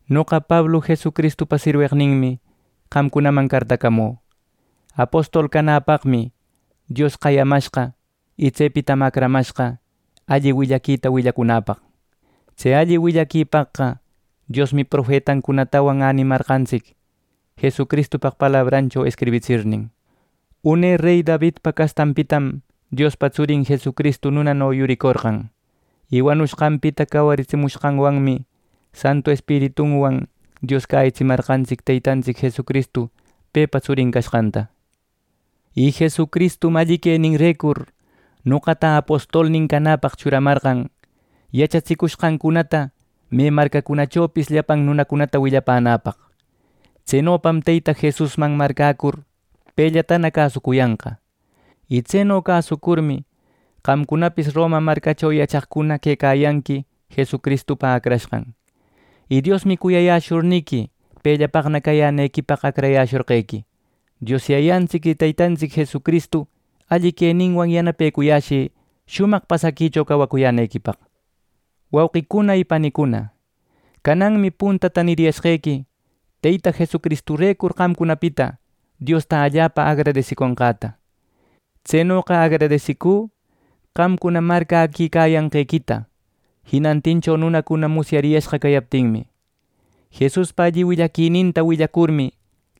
Noqa Pablu, Jesucristupa sirweqninmi, qamcunaman cartacamü. Apostol canapaqmi Dios qayamashqa y tsepitam acramashqa, alli willaquita willacunäpaq. Tse alli willaquipaqqa Diosmi profetancunatawan änimarqantsic, Jesucristupaq palabrancho escribitsirnin. Une rey Davidpa castanpitam Diospa Tsurin Jesucristu nunano yuricorqan. Y wanushqanpita cawaritsimushqanwanmi, Santu Espiritunwan Dios cäyitsimantsic Teytantsic Jesucristu pepa Tsurin cashqanta. Y Jesucristum alli queninrecur noqata apostolnin canäpaq churamarqan yachatsicushqancunata me marcacunachopis llapan nunacunata willapänäpaq. Tsenopam Teyta Jesusman marcäcur pellatana cäsucuyanqa. Y tseno cäsucurmi, qamcunapis Roma marcacho yachaqcuna quecayanqui Jesucristupa acrashqan. Y Diosmi cuyayäshurniqui pellapaqna cayänequipaq acrayäshorqequi. Dios Yayantsic y Teytantsic Jesucristu alli queninwan yanapecuyäshï shumaq pasaquicho cawacuyänequipaq. Wauqicuna y panicuna, cananmi puntata niriyashqequi Teyta Jesucristurecur qamcunapita Diosta allapa agradesiconqäta. Tsenoqa agradesicü, qamcuna marcäquicayanqequita jinantincho nunacuna musyariyashqa cayaptinmi. Jesuspa alli willaquininta willacurmi,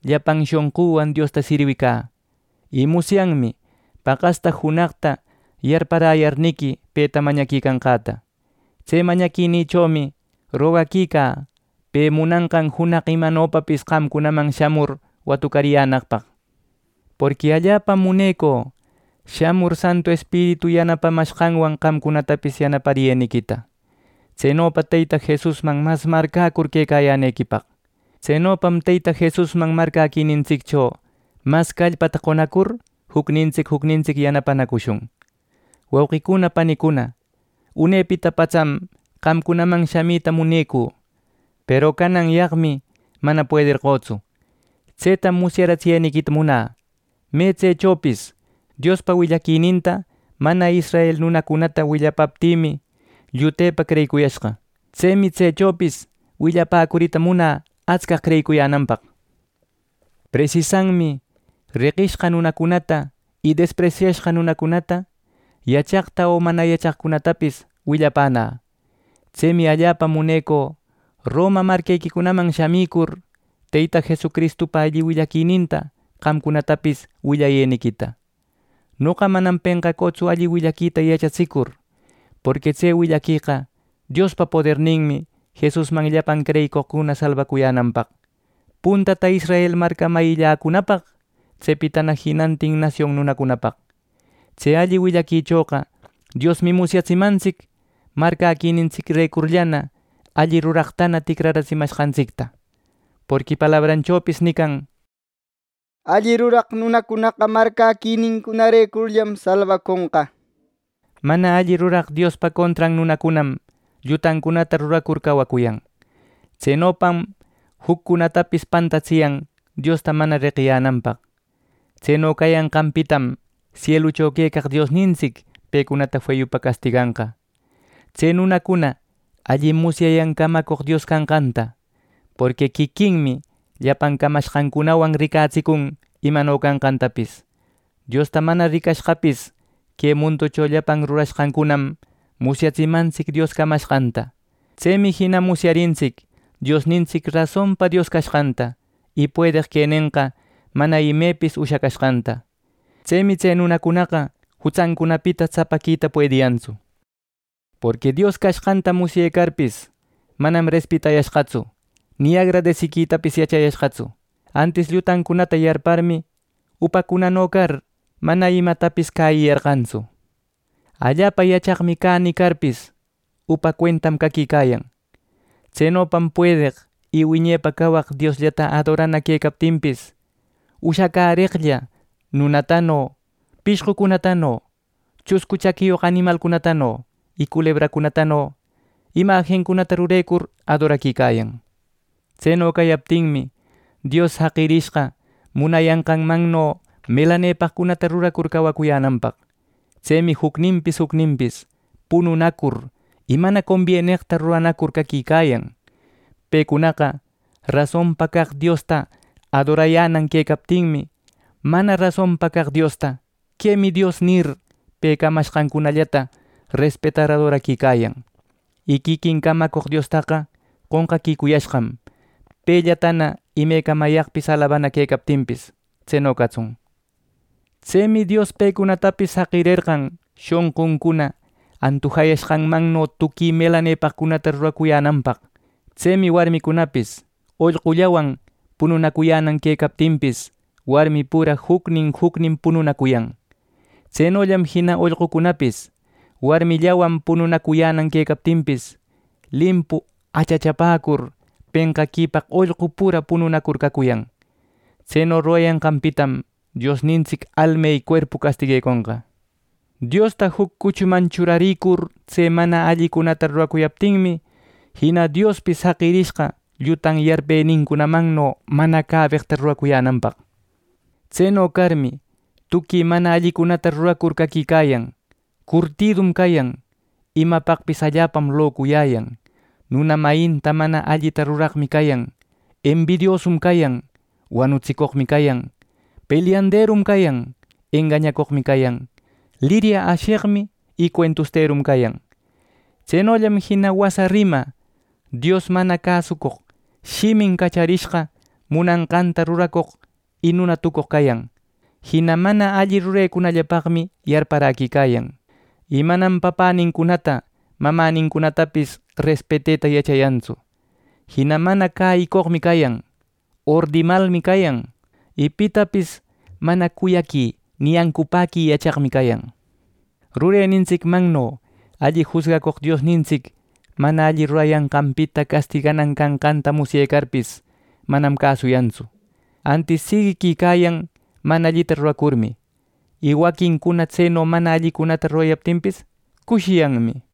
llapan shonquwan Diosta sirwicä, y musyanmi paqasta junaqta yarparäyarniqui peta mañaquicanqäta. Tse mañaquinïchomi rogaquicä pe munanqan junaq imanopapis qamcunaman shamur watucariyänaqpaq. Porqui allapam munecü shamur, Santu Espiritu yanapamashqanwan qamcunatapis yanapariyeniquita. Tsenopa Teyta Jesusman mas marcäcur quecayänequipaq. Tsenopam Teyta Jesusman marcäquinintsiccho mas callpata qonacur jucnintsic jucnintsic yanapanacushun. Wauqicuna panicuna, unepita patsan qamcunaman shamita munecü. Peru cananyaqmi mana puederqötsu. Tsetam musyariyänequita munä. Me tsechopis Diospa willaquininta mana israel nunacunata willapäptïmi llutepa creyicuyashqa. Tsemi tsechopis willapäcurita munä astcaq creyicuyänanpaq. Presisanmi reqishqa nunacunata y despresyashqa nunacunata, yachaqta o mana yachaqcunatapis willapänä. Tsemi allapa munecü Roma marquequicunaman shamicur, Teyta Jesucristupa alli willaquininta qamcunatapis willayeniquita. Noqa manam penqacütsu alli willaquita yachatsicur. Porqui tse willaqueqa Diospa poderninmi Jesusman llapan creyicoqcuna salbacuyänanpaq, puntata israel marcamayilläcunapaq, tsepitana jinantin nasion nunacunapaq. Tse alli willaquichoqa Diosmi musyatsimantsic marcäquinintsicrecurllana alli ruraqtana ticratsimanqantsicta. Porqui palabranchopis nican: “Alli ruraq nunacunaqa marcäquininrecurllam salbaconqa” nirmi. Mana alli ruraq Diospa contran nunacunam llutancunata ruracur cawacuyan. Tsenopam juccunatapis pantatsiyan Diosta mana reqiyänanpaq. Tseno cayanqanpitam sielucho quecaq Diosnintsic pecunata feyupa castiganqa. Tse nunacuna allim musyayan camacoq Dios canqanta. Porqui quiquinmi llapan camashqancunawan ricatsicun imano canqantapis. Diosta mana ricashqapis, que munducho llapan rurashqancunam musyatsimantsic Dios camashqanta. Tsemi jina musyarintsic Diosnintsic rasonpa Dios cashqanta y puedeq quenenqa mana imepis ushacashqanta. Tsemi tse nunacunaqa jutsancunapita tsapaquita puediyantsu. Porqui Dios cashqanta musyecarpis, manam respetayashqatsu ni agradesiquitapis yachayashqatsu; antis llutancunata yarparmi, upacunano car, mana imatapis cäyiyarqantsu. “Allapa yachaqmi cä” nicarpis, upa cuentam caquicayan. Tsenopam puedeq y wiñepa cawaq Diosllata adorana quecaptinpis, ushacäreqlla nunatano, pishqucunatano, chuscu chaquiyoq animalcunatano y culebracunatano imajincunata rurecur adoraquicayan. Tseno cayaptinmi, Dios jaqirishqa munayanqanmanno melanepaqcunata rurar cacuyänanpaq. Tsemi jucninpis jucninpis, pununacur y mana combieneqta ruranacur caquicayan. Pecunaqa rasonpa caq Diosta adorayänan quecaptinmi, mana rasonpa caq diosta “Quemi Dios” nir, pe camashqancunallata respetar adoraquicayan. Y quiquin camacoq Diostaqa qonqaquicuyashqam pellatana imecamayaqpis alabana quecaptinpis. Tseno catsun. Tsemi Dios pecunatapis jaqirerqan shonquncuna antujashqanmanno tuqui melanepaqcunata ruracuyänanpaq. Tsemi warmicunapis ollqullawan pununacuyänan quecaptinpis, warmi pura jucnin, jucnin pununacuyan. Tsenollam jina ollqucunapis warmillawan pununacuyänan quecaptin, limpu achachapäcur, penqaquipaq ollqu pura pununacur cacuyan. Tseno rurayanqanpitam Diosnintsic alma y cuerpu castigueconqa. Diosta juc cuchuman churarïcur tse mana allicunata ruracuyaptinmi, jina Diospis jaqirishqa llutan yarpenincunamanno mana cabeqta ruracuyänanpaq. Tseno carmi, tuqui mana allicunata ruracur caquicayan; curtidum cayan; imapaqpis allapam locuyäyan; nuna mayinta mana allita ruraqmi cayan; embidiosum cayan; wanutsicoqmi cayan; pelyanderum cayan; egañacoqmi cayan; lirya asheqmi y cuentusterum cayan. Tsenollam jina wasa rima, Dios mana cäsoq, shimin cacharishqa, munashqanta ruracoq y nuna tucoq cayan. Jina mana alli rurecunallapaqmi yarparaquicayan y manam papänincunata, mamänincunatapis respeteta yachayantsu. Jina mana cäyicoqmi cayan; ordimalmi cayan; y pitapis mana cuyaqui ni ancupäqui yachaqmi cayan. Rurenintsicmanno alli jusgacoq Diosnintsic mana alli rurayanqanpita castiganan canqanta musyecarpis, manam cäsuyantsu; antis siguiquicayan mana allita ruracurmi, y waquincuna tseno mana allicunata rurayaptinpis cushiyanmi.